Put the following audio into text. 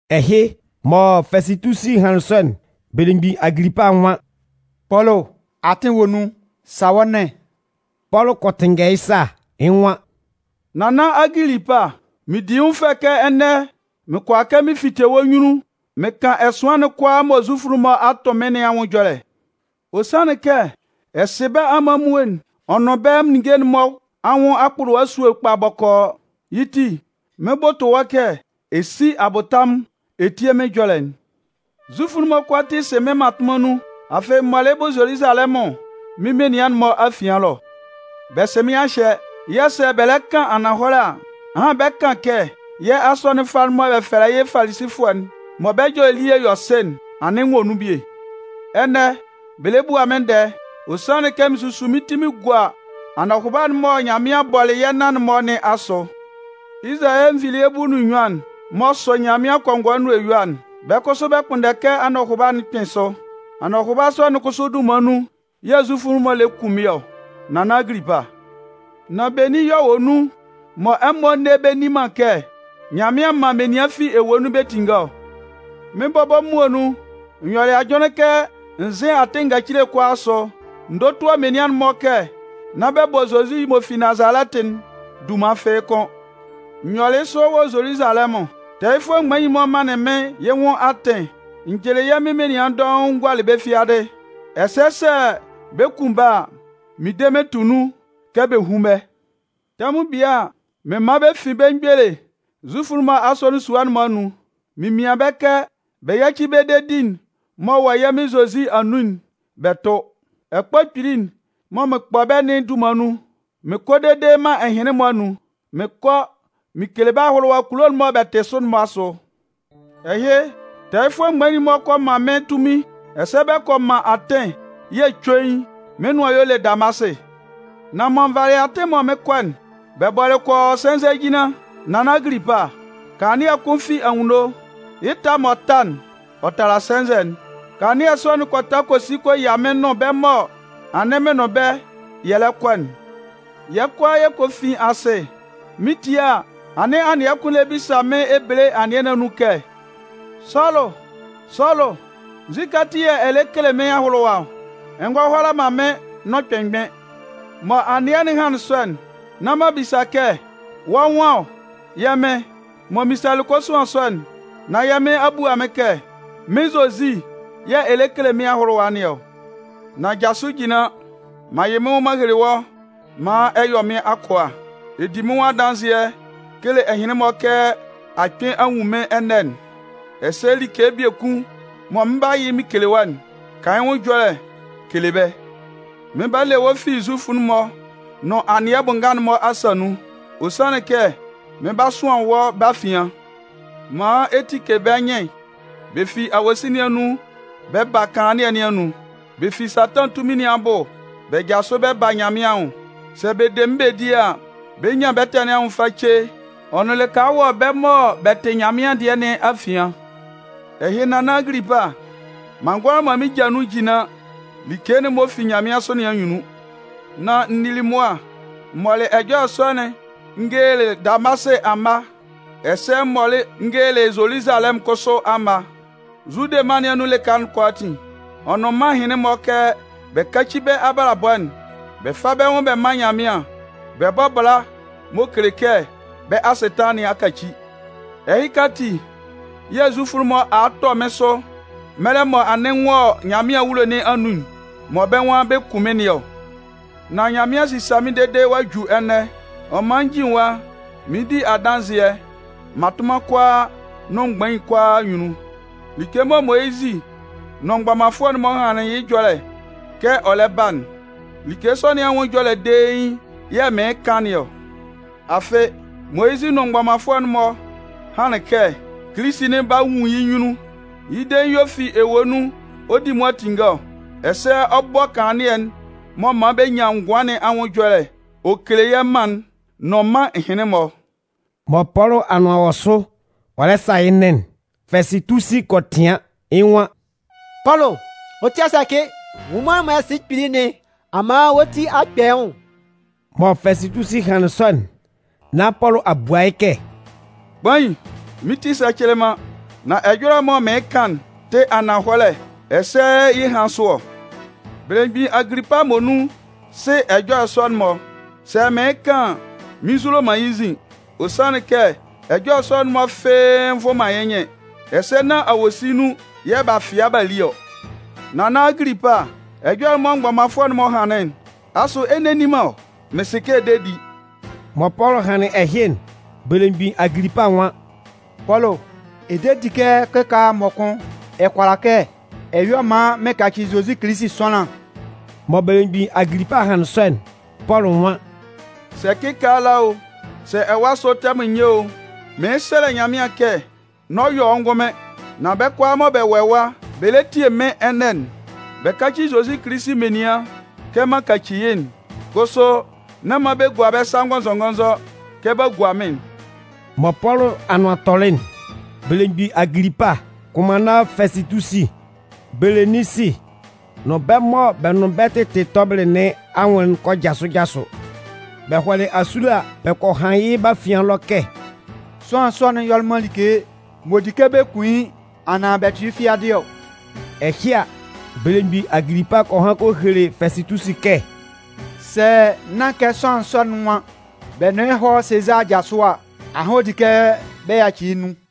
Ɛhɩ, mɔ Fɛsɩtusi hanlɩn sɔ'n, belemgbin Agilipa nwan: “Pɔlʋ, atɩn wɔ nun, sa wɔ́ nɩn.” Pɔlʋ kɔ tɩnngɛ yɩ́ sa, yɩ́ nwan: “Nannan Agilipa, mɩn di yɩ́ nwʋn fɛ kɛ ɛnɛ mɩn kʋala kɛ mɩn fite wɔ́ nyunnun mɩn kan ɛsʋan'n kʋalaa mɔ Zufʋ'n-mɔ a tʋn mɩ́n nɩn anwʋn ɛjɔlɛ. Ɔ sanlɩn kɛ ɛ sɩ bɛ́ amanmuo'n ɔ nʋn bɛ́ ninnge'n-mɔ anwʋn akpʋlʋwa esúe'n kpa bɔkɔɔ. Yɩ́ ti, mɩn 'bʋtʋ wɔ́ kɛ ɛ sí abʋtamʋn ɛ tíe mɩ́n ɛjɔlɛ'n. “Zufʋ'n-mɔ kʋalaatin sɩ mɩ́n mmatʋnman nun, afɩ m mɔlɩ yɩ́ bʋ Zoluzalɛmʋn mɩ́n menian'n-mɔ afian ɛlɔ. Bɛ sɩ mɩ́n a hyɛ yɛ̂ sɛ bɛ lɛ kan ananhɔlɛ a, ahan bɛ 'kan kɛ yɛ́ asɔnɩn fâ'n mɔ bɛ fɛlɛ yɩ́ Falisifʋɛ'n, mɔ bɛ́ ɛjɔlɛ elie yɔ sɩ'n, anɩn n wɔ nun bie. Ɛnɛ, bɛ lɛ bua mɩ́n ndɛɛ, ɔ sanlɩn kɛ mɩn susu mɩ́n ti mɩn gua anɔhʋba'n mɔ Nyanmɩan bɔlɩ yɛ́ nan-mɔ nɩn asʋ. Izalayɛ nvilie bulu nʋn nnyuan'n m'ɔ sʋ Nyanmɩan kɔngɔɛ nʋn eyua'n, bɛ́ kʋsʋ bɛ kpʋnndɛ kɛ anɔhʋba'n kpɩn sʋ. Anɔhʋba sɔ'n kʋsʋ dunman nun yɛ̂ Zufʋ'n-mɔ lɛ kun mɩ́n ɔ, Nannan Agilipa! Nan benin yɛ̂ ɔ wɔ nun, mɔ ɛmɔ nne bɛ nni man kɛ Nyanmɩan man menian fi ewue nun bɛ tinnge ɔ? “Mɩ́n bɔbɔ muonun, n yɔlɩ ajʋnlɩn kɛ n zɩ́n atɩn ngacile kʋalaa asʋ n dótua menian'n-mɔ kɛ nán bɛ bɔ Zozi m'ɔ fi Nazalɛtɩ'n dunman fɩ́ɩ́ kʋ́n. N yɔlɩ yɩ́ sɔ wɔ Zoluzalɛmʋn. Tɛɛyɩfʋɛ mgbain'n-mɔ manlɩn mɩ́n yɩ́ nwʋn atɩn, n jɩlɩ yɛ́ Mɩn menian dɔʋn n gualɩ bɛ́ fiadɩ. Ɛsɛ sɛ bɛ 'kun bɛ́ a, mɩn de mɩn tʋ nun kɛ bɛ hún bɛ́. Tɛmʋn bie a, mɩn man bɛ fin bɛ́ mgbele Zufʋ'n-mɔ asɔnɩn sua'n-mɔ anun, mɩn mian bɛ́ kɛ bɛ yáci bɛ́ dedi'n m'ɔ wɔ yɛ́ Mɩn Zozi anun'n bɛ tʋ́. Ɛkpɔ kpili'n mɔ mɩn kpɔ bɛ́ nɩn dunman nun, mɩn kɔ dede mân ɛhɩnlɩn-mɔ anun, mɩn kɔ mɩn kele bɛ́ ahʋlʋwa kulo'n mɔ bɛ tɩ sʋ'n-mɔ asʋ. “Ɛhɩ, tɛɛyɩfʋɛ mgbain'n-mɔ kɔ man mɩ́n tunmin ɛsɛ bɛ kɔ man atɩn yɛ̂ cuein, mɩ́n nʋan y'ɔ le Damasɩ. Nan mɔ n valɩ atɩn'n mɔ mɩn 'kɔ'n, bɛ bɔlɩ kɔ yɔ sɛnzɛjinlan, nannan Agilipa, kanlannɩɛ kʋn fi anwunno, yɩ́ ɛta m'ɔ ta'n, ɔ tala sɛnzɛ'n. Kanlannɩɛ sɔ'n kɔ ta kɔ si kɔ yia mɩ́n nʋn bɛ́ mɔ anɩn mɩn nʋn bɛ́, yɛ lɛ kɔ'n. Yɛ́ kʋalaa yɛ kɔ fin asɩ. Mɩn 'tie a, anɩn anɩɛ kʋn lɛ bisa mɩ́n Ebele anɩɛ nɩn anun kɛ: ‘Sɔlʋ, Sɔlʋ, nzukɛ ati yɛ̂ ɛ lɛ kele mɩ́n ahʋlʋwa ɔ? Ɛ ngɔ hʋala man mɩ́n nʋn kpɩnmgbɩn.’ “Mɔ anɩɛ'n hanlɩn sɔ'n, nán m'an bisa kɛ: ‘Wɔ́ nwan ɔ, yɛ́ Mɩn?’ “Mɔ m misalɩ kosuan sɔ'n, nán yɛ́ Mɩn a bua mɩ́n kɛ: ‘Mɩ́n Zozi yɛ̂ ɛ lɛ kele mɩ́n ahʋlʋwa nɩn ɔ. Nan jasʋ jinlan. M'an yɩ mɩ́n nwʋn m'an hele wɔ́ maan ɛ yɔ mɩ́n akʋa, ɛ di mɩ́n nwʋn adanzɩɛ kele ɛhɩnlɩn-mɔ kɛ a kpɩn a nwun mɩ́n ɛnɛ'n, ɛsɛ like biekun mɔ mɩn 'ba yɩ mɩn kele wɔ́'n, kan yɩ́ nwʋn ɛjɔlɛ kele bɛ́. Mɩn 'ba le wɔ́ fi Zufʋ'n-mɔ nʋn anɩɛ bʋ nga'n-mɔ asa nun. Ɔ sanlɩn kɛ mɩn 'ba sʋan wɔ́ bɛ́ afian maan ɛ tike bɛ́ nyɩn bɛ fi awosin nɩn anun bɛ ba kanlannɩɛ nɩn anun, bɛ fi Satan tunmin nɩn abʋ bɛ jasʋ bɛ ba Nyanmɩan anwʋn. Sɛ bɛ de mɩ́n bɛ di a, bɛ 'nyan bɛ́ ɛtɛ nɩn anwʋn face ɔ nʋn lɩka wɔ bɛ́ mɔ bɛ tɩ Nyanmɩan dɩɛ nɩn afian.’ “Ɛhɩ, nannan Agilipa, m'an ngʋala man mɩ́n ja nun jinlan like'n m'ɔ fi nyanmɩansʋ nɩn anyunnun. Nan n nili mʋa m mɔlɩ ɛjɔlɛ sɔ'n n gelelɩ Damasɩ amma, ɛsɛ m mɔlɩ n gelelɩ Zoluzalɛmʋn kʋsʋ amma, Zude mân nɩn anun lɩka kʋalaatin, ɔ nʋn mân ɛhɩnlɩn-mɔ kɛ bɛ káci bɛ́ abalabɔ'n bɛ fá bɛ́ nwʋn bɛ mán Nyanmɩan, bɛ bɔ́ bala m'ɔ kele kɛ bɛ́ asɩtanlan nɩn a kaci. Ɛhɩka ati yɛ̂ Zufʋ'n-mɔ a a tɔ mɩ́n sʋ mɛlɛ mɔ anɩn n wɔ Nyanmɩan awulo nɩn anun mɔ bɛ́ nwan bɛ 'kun mɩ́n nɩn ɔ. Nan Nyanmɩan a sisa mɩ́n dede ɔ'a ju ɛnɛ, ɔ man n jin ɛwa mɩɩn di adanzɩɛ mmatʋnman kʋalaa nʋn mgbain kʋalaa anyunnun. Like mɔ Moyizɩ nʋn mgbɔmanfʋɛ'n-mɔ hanlɩn yɩ́ ɛjɔlɛ kɛ ɔ lɛ ba'n, like sɔ nɩn anwʋn ɛjɔlɛ dein yɛ̂ mɩɩn kan nɩn ɔ. Afɩ, Moyizɩ nʋn mgbɔmanfʋɛ'n-mɔ hanlɩn kɛ Kilisi'n 'ba nwun yɩ́ nyunnun, yɩ́ dein y'ɔ fi ewue nun ɔ 'di mʋa tinnge ɔ, ɛsɛ ɔ 'bɔ kanlannɩɛ'n m'ɔ man bɛ nyan ngʋan nɩn anwʋn ɛjɔlɛ ɔ kele yɛ́ mân'n nʋn mân ɛhɩnlɩn-mɔ.” Mɔ Pɔlʋ anʋan wɔ sʋ ɔ lɛ sa yɩ́ nɩn'n, Fɛsɩtusi kɔ tɩan, yɩ́ nwan: “Pɔlʋ, wɔ́ ti a sɛcɩ! Nwʋnman'n mɔ ɛ sɩ yɩ́ kpili nɩn a man wɔ́ ti a kpɛ yɩ́ nwʋn!” Mɔ Fɛsɩtusi hanlɩn sɔ'n, nán Pɔlʋ a bua yɩ́ kɛ: “Kpain, mɩ́n ti sɛcɩlɩ man. Nan ɛjɔlɛ'n mɔ mɩɩn kan'n tɩ ananhɔlɛ ɛsɛ yɩ́ ɛhan sʋ ɔ. Belemgbin Agilipa muonun sɩ ɛjɔlɛ sɔ'n-mɔ. Sɛ mɩɩn kan an, mɩn nzulo man yɩ́ nzin. Ɔ sanlɩn kɛ, ɛjɔlɛ sɔ'n-mɔ fɩ́ɩ́ nvʋn man yɩ́ nyɩn, ɛsɛ nán awosin nun yɛ̂ b'a fɩa b'a li ɔ. Nannan Agilipa, ɛjɔlɛ'n mɔ mgbɔmanfʋɛ'n-mɔ hanlɩn'n, asʋ ɛ nne ɛ nni man ɔ? Mɩn sɩ kɛ ɛ de di!” Mɔ Pɔlʋ hanlɩn ɛhɩ'n, belemgbin Agilipa nwan: “Pɔlʋ, ɛ de di kɛ kɩkaala mɔkʋn ɛ kʋala kɛ ɛ yɔ maan mɩn kaci Zozi Kilisi sʋanlan?” Mɔ belemgbin Agilipa hanlɩn sɔ'n, Pɔlʋ nwan: “Sɛ kɩkaala o, sɛ ɛwa asʋ tɛmʋn nyɛ o, mɩɩn sɛlɛ Nyanmɩan kɛ nán ɔ yɔ wɔ́ ngʋnmɩn, nan bɛ́ kʋalaa mɔ bɛ wɔ ɛwa bɛ lɛ tie mɩ́n ɛnɛ'n, bɛ káci Zozi Kilisi menian kɛ m'an kaci yɩ́'n. Kʋsʋ, nán man bɛ gua bɛ́ sa ngɔnzɔngɔnzɔ kɛ b'a gua mɩ́n'n!” Mɔ Pɔlʋ anʋan tɔlɩ'n, belemgbin Agilipa, kʋnmanna Fɛsɩtusi, Beleninsi nʋn bɛ́ mɔ bɛ nʋn bɛ́ tɩtɩ tɔbɩlɩ nɩn anwʋn'n kɔ jasʋ jasʋ. Bɛ hɔlɩ asule a, bɛ kɔ han yɩ́ bɛ́ afian ɛlɔ kɛ: “Sʋanlan sɔ'n yɔlɩ man like m'ɔ di mɔ kɛ kun yɩ́ anaan bɛ tʋ yɩ́ fiadɩ ɔ.” Ɛhɩ a, belemgbin Agilipa kɔ han kɔ hele Fɛsɩtusi kɛ: “Sɛ nán kɛ sʋanlan sɔ'n nwan bɛ nʋn yɩ́ hɔ́ Sezaa aja sʋ a, ahan ɔ di kɛ bɛ yaci yɩ́ nun.”